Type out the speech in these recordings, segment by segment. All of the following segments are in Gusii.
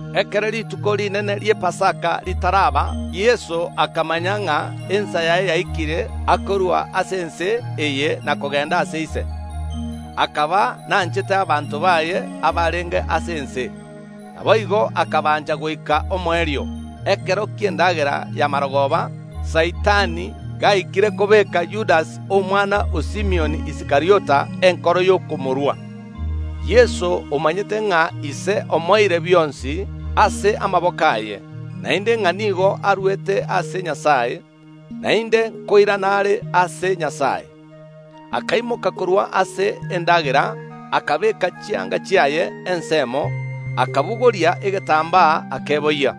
Ekero rituko rinene ri’Epasaka ritaraba, Yeso akamanya ng’a ensa yaye yaikire akorua ase ense eye na kogenda ase Ise, akaba nanchete abanto baye abarenge ase ense, naboigo akabancha goika omoerio. Ekero ki’endagera ya mogoroba, Saitani gaikire kobeeka Yudasi omwana o Simioni Iskariota enkoro y’okomorua, Yeso omanyete ng’a Ise omoeire bionsi ase amaboko aye, naende ng’a nigo arwete ase Nyasae, naende nkoirana are ase Nyasae. Akaimoka korwa ase endagera, akabeeka chianga chiaye ensemo, akabogoria egetambaa, akeboyia.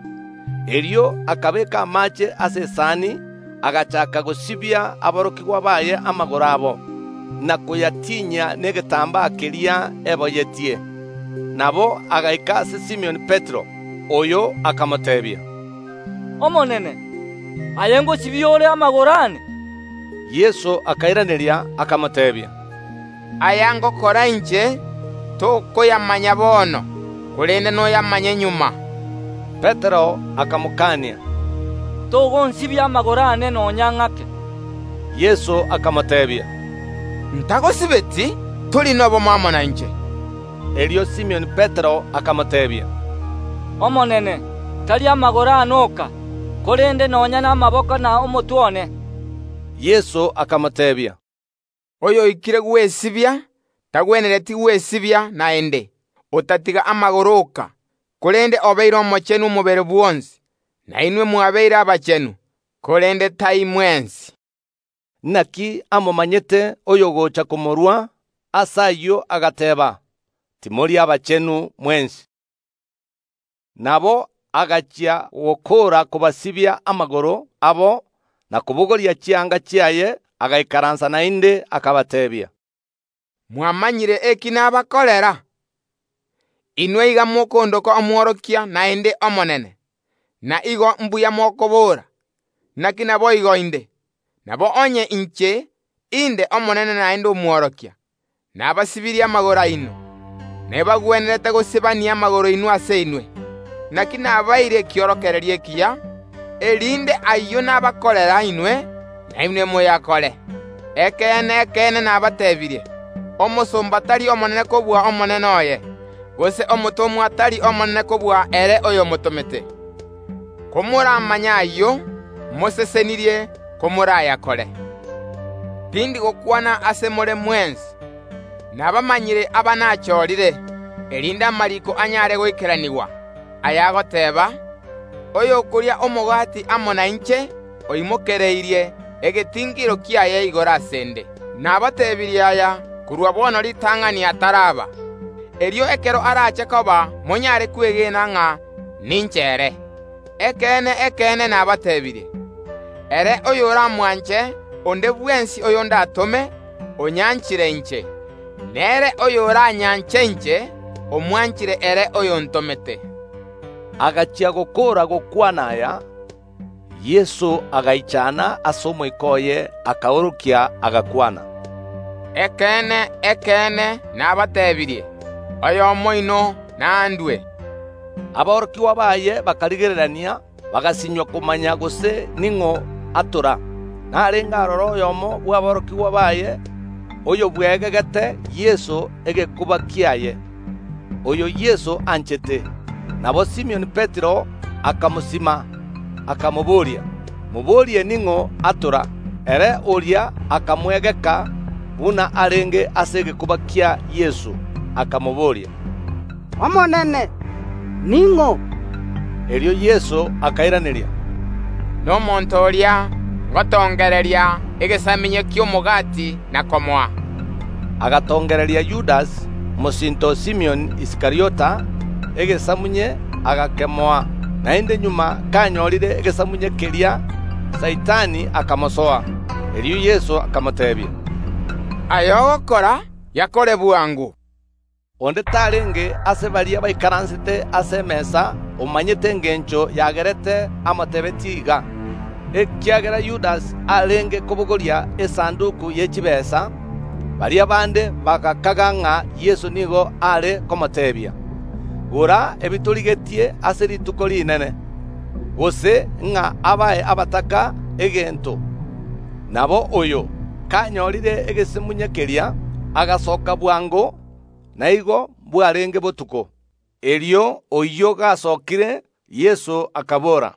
Erio akabeeka amaache ase esani, agachaaka gosibia aborokigwa baye amagoro abo, na koyatinyia negetambaa keria eboyetie. Nabo agaika ase Simioni Petero, Oyo akamoteebia, “Omonene! Aye ngosibia ore amagoro aane?” Yeso akairaneria, akamoteebia, “Aya ngokora inche, tokoyamanya bono, korende noyamanye magega.” Petero akamokania, “Togonsibia amagoro aane nonya ng’ake.” Yeso akamoteebia, “Ntagosibeti, tori nobomo amo nainche.” Erio Simioni Petero akamoteebia, “Omonene, tari amagoro aane oka, korende nonya namaboko na omotwe one.” Yeso akamoteebia, “Oyoikire gwesibia tagwenereti gwesibia naende, otatiga amagoro oka, korende obeire omochenu omobere bwonsi; na inwe mwabeire abachenu, korende tai mwensi.” Naki amomanyete oyogocha komorua; ase ayio agateeba, “Timori abachenu mwensi.” Nabo agachia gokoora kobasibia amagoro abo na kobogoria chianga chiaye, agaikaransa naende, akabateebia, “Mwamanyire eki nabakorera? Inwe iga mokondoka Omworokia, naende Omonene; na igo mbuya mokobora, naki naboigo inde. Nabo onye inche, inde Omonene naende Omworokia, nabasibirie amagoro aino, nebagwenerete gosibania amagoro inwe ase inwe. Naki nabaeire ekiorokererio ekiya, erinde ayio nabakorera inwe, nainwe moyakore. Ekeene, ekeene, nabateebirie: Omosomba tari omonene kobua omonene oye, gose omotomwa tari omonene kobua ere oyomotomete. Komoramanye ayio, mosesenirie komorayakore. Tindi gokwana ase more mwensi; nabamanyire aba nachorire, erinde amariiko anyare goikeranigwa, ayagoteeba: Oyokoria omogati amo nainche oimokereirie egetingiro kiaye igoro ase ’nde. Nabatebirie aya korwa bono ritang’ani ataraba, erio ekero arache koba monyare kwegena ng’a ninche ere. Ekeene, ekeene, nabateebirie: Ere oyoramwanche onde bwensi oyo ndatome, onyanchire inche; nere oyoranyanche inche omwanchire ere oyontomete.” Agachia gokoora gokwana aya, Yeso agaichana ase omoika oye, akaorokia, agakwana, “Ekeene, ekeene, nabateebirie: Oyomo oino nandue.” Aborokigwa baye bakarigererania, bagasinywa komanya gose ning’o atora. Narenge aroro oyomo bw’aborokigwa baye, oyobweegegete Yeso egekuba kiaye, oyo Yeso anchete. Nabo Simioni Petero akamoraga, akamobooria, “Moborie ning’o atora?” Ere oria akamweegeka buna arenge ase egekuba kia Yeso, akamobooria, “Omonene, ning’o?” Erio Yeso akairaneria, “Nomonto oria ngotongereria egesamunye ki’omogati na komoa.” Agatongereria Yudasi, mosinto o Simioni Iskariota, egesamunye, agakemoa. Naende magega kanyorire egesamunye keria, Saitani akamosoa. Erio Yeso akamoteebia, “Aya ogokora, yakore bwango.” Onde tarenge ase baria baikaransete ase emesa omanyete engencho yagerete amotebetie iga. Ekiagera Yudasi arenge kobogoria esanduki ye chitaabu, baria bande bagakaga ng’a Yeso nigo are komoteebia, “Gora ebitorigetie ase Rituko Rinene”, gose ng’a abae abataka egento. Nabo oyo, kanyorire egesamunye keria agasoka bwango; na igo bwarenge botuko. Erio oyio gasokire, Yeso akabora,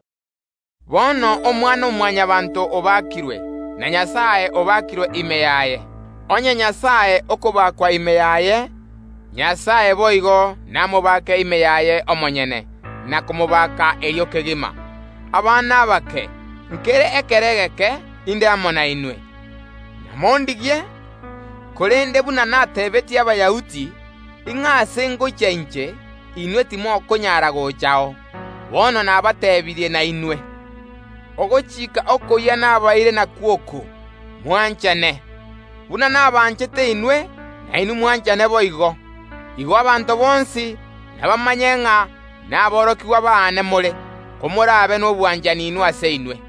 “Bono Omwana‐o‐Mwanyabaanto obakirwe, na Nyasae obakirwe ime yaye. Onye Nyasae okobakwa ime yaye, Nyasae boigo namobake ime yaye omonyene, na komobaka erio kegima. Abana abake, nkere ekero egeke inde amo nainwe. Namondigie; korende buna natebeetie Abayahudi, ng’a aase ngochia inche, inwe timokonyara gochao, bono nabateebirie nainwe. Ogochika okoyia nabaeire nakwo oko, mwanchane. Buna nabanchete inwe, nainwe mwanchane boigo. Igo abanto bonsi nabamanye ng’a naborokigwa baane more, komorabe nobwanchani inwe ase inwe.”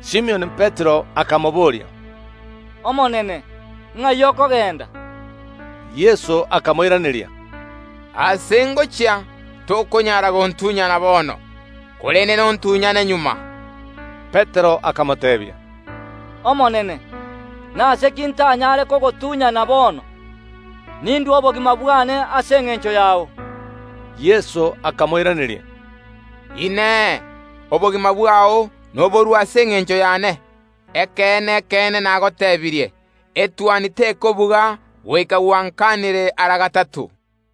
Simioni Petero akamobooria, “Omonene, ng’ai okogenda?” Yeso akamoiraneria, “Aase ngochia tokonyara gontunyana bono, korende nontunyane magega.” Petero akamoteebia, “Omonene, nase ki ntanyare kogotunyana bono? Nindue obogima bwane ase engencho yao.” Yeso akamoiraneria, “Inee! Obogima bwao noborue ase engencho yane? Ekeene, ekeene, nagotebirie: Etuoni tekobuga goika gwankanire ara gatato.